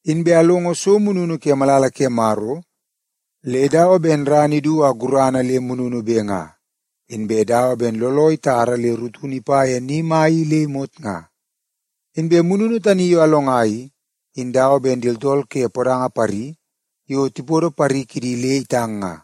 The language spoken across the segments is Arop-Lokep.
Inbe alongo so mununu ke malala ke Maro le dawa ben ran idu a gurana le mununube nga, inbe dawa ben looloo itara le rutunu ipa ye ni mai i le imot nga. Inbe mununu tani yo alonga i, in dawa ben di tooltool ke podanga pari yo tipodo pari kidi le itang nga.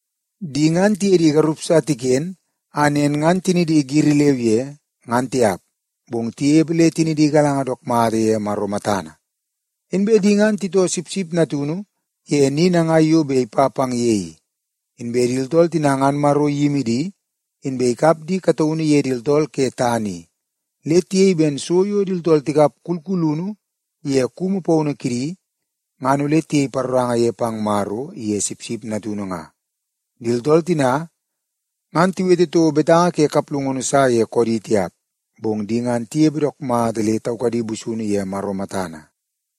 Di ngan tiye di garup sa tiken a nen ngan tinidi giri leu ye ngan tiap, bong tinepe le tinidi igalanga dook mata ye Maro matana. Inbe di ngan titoo Sipsip Natunu ye ni nangai yo bet ipa pang ye i. Inbe di tooltool tina ngan Maro iyimi di, inbe ikap di kataunu ye di tooltool ke tana i, le tiyei ben so yo di tooltool tikap kulkulunu ye kumu paunu kidi ngan ole tiyei paroranga ye pang Maro iye Sipsip Natunu nga. Di tooltool tina ngan tiwete toko betanga ke kaplungunu sa ye koodi tiap. Bong di ngan tinepe dook mata le taukadi busunu ye Maro matana.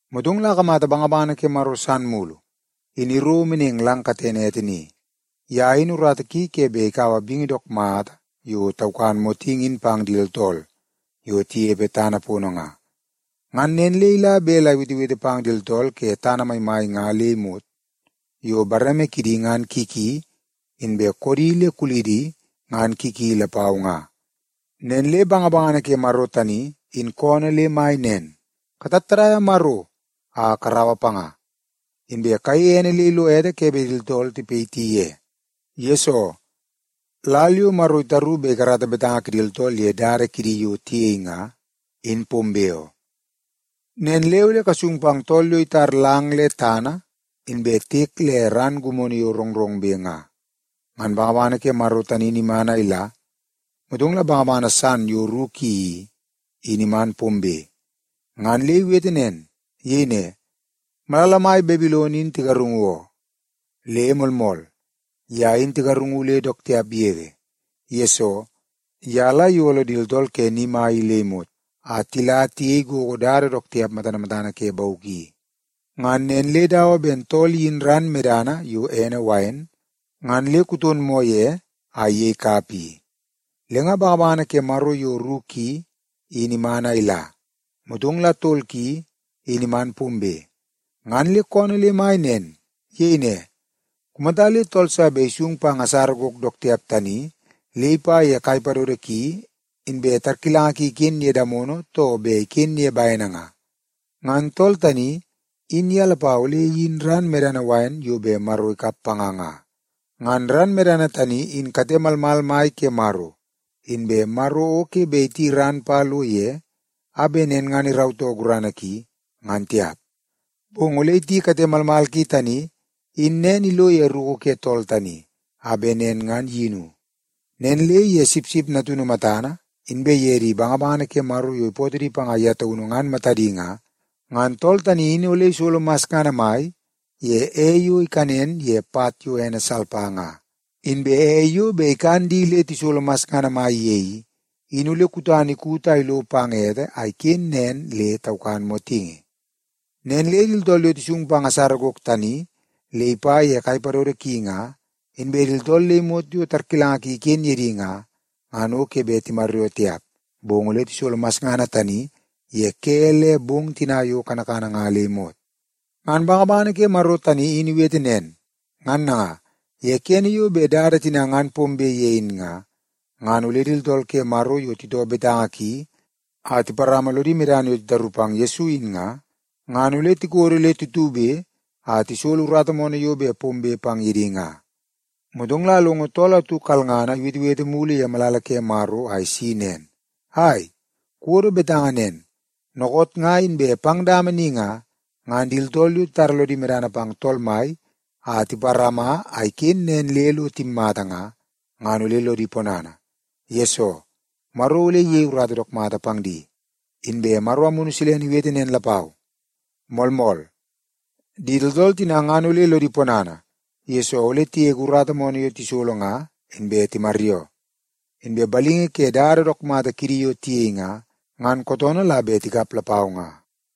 Motong la akamata bangabangana ke Maro san mulu, in iro meneng lang katene ete ni. Ye in urata ki ke bet ikaua bingi dook mata yo taukan motingi in pang di tooltool yo tinepe tana pono nga. Ngan nen le ila bet la iwetewete pang di tooltool ke tana maimai nga le imot yo bareme kidi ngan ki ki, inbe koodi le kulidi ngan ki ki lapau nga. Nen le bangabangana ke Maro tani in koonoo le mai nen, “Katattadaia Maro a karaua panga. Inbe kayeie ene le ilo ete ke bet di tooltool tipayiti ye, yesoo lal yo Maro itaru bet ikarata betanga kidi tooltool ye dada kidi yo tiyei nga, in pombe oo. Nen le ole kasung pang tool yo itar lang le tana inbe tiek le ran gimono yo rongrongbe nga.” Ngan bangabangana ke Maro tani in iman a ila, motong la bangabangana san yo ru ki i, in iman pombe ngan le iwete nen. Iyei ne, “Malala mai Babilon in tigarungu oo. Le moolmool, ye in tigarungu le dook tiap yege, yesoo ye la iyolo di tooltool ke ni mai i le imot, a la tiyei gogo dada dook tiap matana matana ke bauk i. Ngan nen le dawa ben tool iyin ran medana yo ene wain ngan le kuton moo ye a iyei kapa i.” Le nga bangabangana ke Maro yo ru ki in iman a ila, motong la tol ki, in iman pombe, ngan le koonoo le mai nen. Iyei ne, “Kumata le tool sa bet isung pang asara gok dook tiap tani le ipa ye kai padodo ki, inbe tarkilanga ki iken ye damono too bet iken ye bene nga, ngan tool tani in ye lapau ole iyin ran medana wain yo bet Maro ikap panga nga. Ngan ran medana tani in kate malmal mai ke Maro. Inbe Maro o ke bet iti ran pa lo ye a bet nen ngan irautoo gurana ki, ngan tiap. Bong ole iti kate malmal ki tani in nen ilo ye ruku ke tool tani, a bet nen ngan iyinu. Nen le ye Sipsip Natunu matana, inbe ye di bangabangana ke Maro yo ipootoo di panga ye taunu ngan matadi nga, ngan tool tani in ole isolo masngana mai ye ei yo ikanen ye pat yo ene salpa nga. Inbe ei yo bet ikan di le tisolo masngana mai ye i, in ole kutana ikut a ilo ete a iken nen le taukan motingi. Nen le di tooltool yo tisung pang asara gok tani le ipa ye kai padodo ki nga, inbe di tooltool le imot yo tarkilanga ki iken ye di nga, ngan o ke bet timaryoo tiap, bong ole tisolo masngana tani ye ke le bong tina yo kanakana nga le imot.” Ngan bangabangana ke Maro tani in iwete nen. Ngan nanga, ye kene yo bet dada tina ngan pombe ye in nga, ngan ole di tooltool ke Maro yo titoo betanga ki a tiparama lodi medana yo titaru pang Yesu in nga, ngan ole tikodo le tutube a tisolo urata moonoo yo bet pombe pang ye di nga. Motong la alongo tool atu kalngana iwetewete mulu ye malala ke Maro a isi nen, “Ai, kuwodo betanga nen. Dookoot nga inbe pang dama ni nga, ngan di tooltool yo titara lodi medana pang Tool Mai a tiparama a iken nen le lo timmata nga, ngan ole lodi ponana, yesoo Maro ole iyei urata dook mata pang di.” Inbe Maro Amunu Silene iwete nen lapau, “Moolmool. Di tooltool tina ngan ole lodi ponana, yesoo ole tigege urata moonoo yo tisolo nga inbe timaryoo. Inbe balingi ke dada dook mata kidi yo tiyei nga, ngan kootoonoo la bet tikap lapau nga.”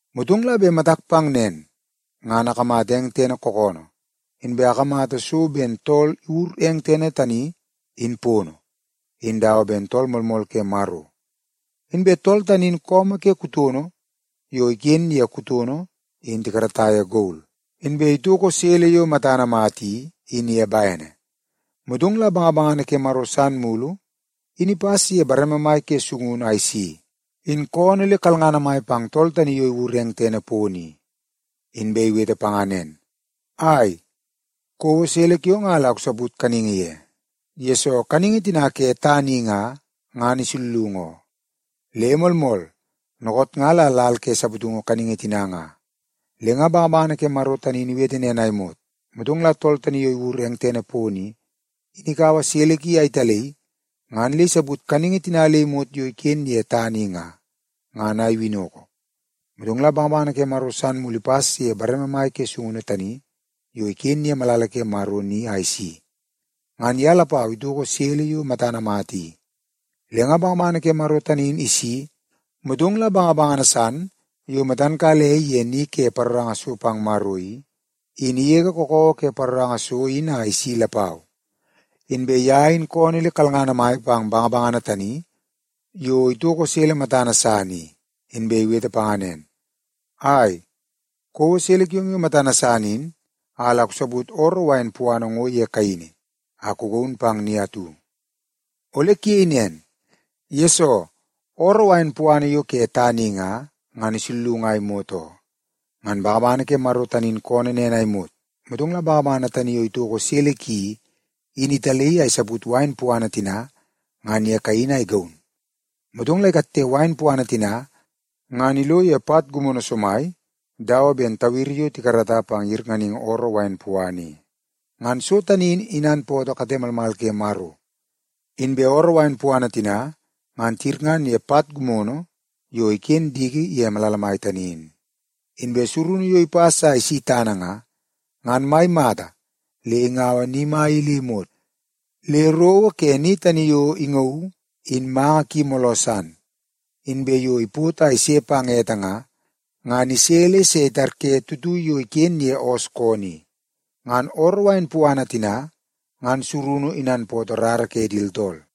Motong la bet matak pang nen, ngan akamata eng tene kookoonoo, inbe akamata so ben tool iwur eng tene tani in pono, in dawa ben Tool Moolmool Ke Maro. Inbe tool tani in su ke kutono yo iken ye kutono in tikarata ye gol, inbe itoko sele yo matana mata i, in ye bene. Motong la bangabangana ke Maro san mulu in ipas ye bareme mai ke sungunu a isi, in koonoo le kalngana mai pang tool tani yo iwur eng tene pono i. Inbe iwete panga nen, “Ai, kouo sele kiong a la kusaput kaningi ye, yesoo kaningi tina ke tana i nga, ngan isullungu oo. Le moolmool, dookoot nga la lal ke saputungu kaningi tina nga.” Le nga bangabangana ke Maro tani in iwete nen a imot, motong la tool tani yo iwur eng tene pono i, in ikaua sele ki a italaii ngan le isaput kaningi tina le imot yo iken ye tana i nga, ngan a iwinnoko. Motong la bangabangana ke Maro san mulu ipas ye bareme mai ke sungunu tani yo iken ye malala ke Maro ni a isi. Ngan ye lapau itoko sele yo matana mata i. Le nga bangabangana ke Maro tani in isi, motong la bangabangana san yo matan kala ei ye ni ke paroranga so pang Maro i, in igege kakawa ke paroranga so in a isi lapau. Inbe ye in koonoo le kalngana mai pang bangabangana tani yo itoko sele matana san i, inbe iwete panga nen, “Ai, kouo sele kiong yo matana san in a la kusaput ooroo wain puana ngo ye kaini a kugaun pang ni atu. Ole kuyei nen, yesoo ooroo wain puana yo ke tana i nga, ngan isullungu a imot oo.” Ngan bangabangana ke Maro tani in koonoo nen a imot, motong la bangabangana tani yo itoko sele ki i, in italaii a isaput wain puana tina ngan ye kaini a igaun. Motong la ikatte wain puana tina ngan ilo ye pat gimono somai dawa ben tawiri yo tikarata pang yirnganingi ooroo wain puana i. Ngan so tani in inanpootoo kate malmal ke Maro. Inbe ooroo wain puana tina ngan tiyirngan ye pat gimono yo iken diki ye malala mai tani in. Inbe surunu yo ipas a isi tana nga, ngan mai mata le ingaua ni mai i le imot le rowo ke ni tani yo ingauu in manga ki mooloo san. Inbe yo ipot a ise pang ete nga, ngan ise le se itarye tuitui yo iken ye oos koonoo i. Ngan ooroo wain puana tina ngan surunu inanpootoo rara ke di tooltool.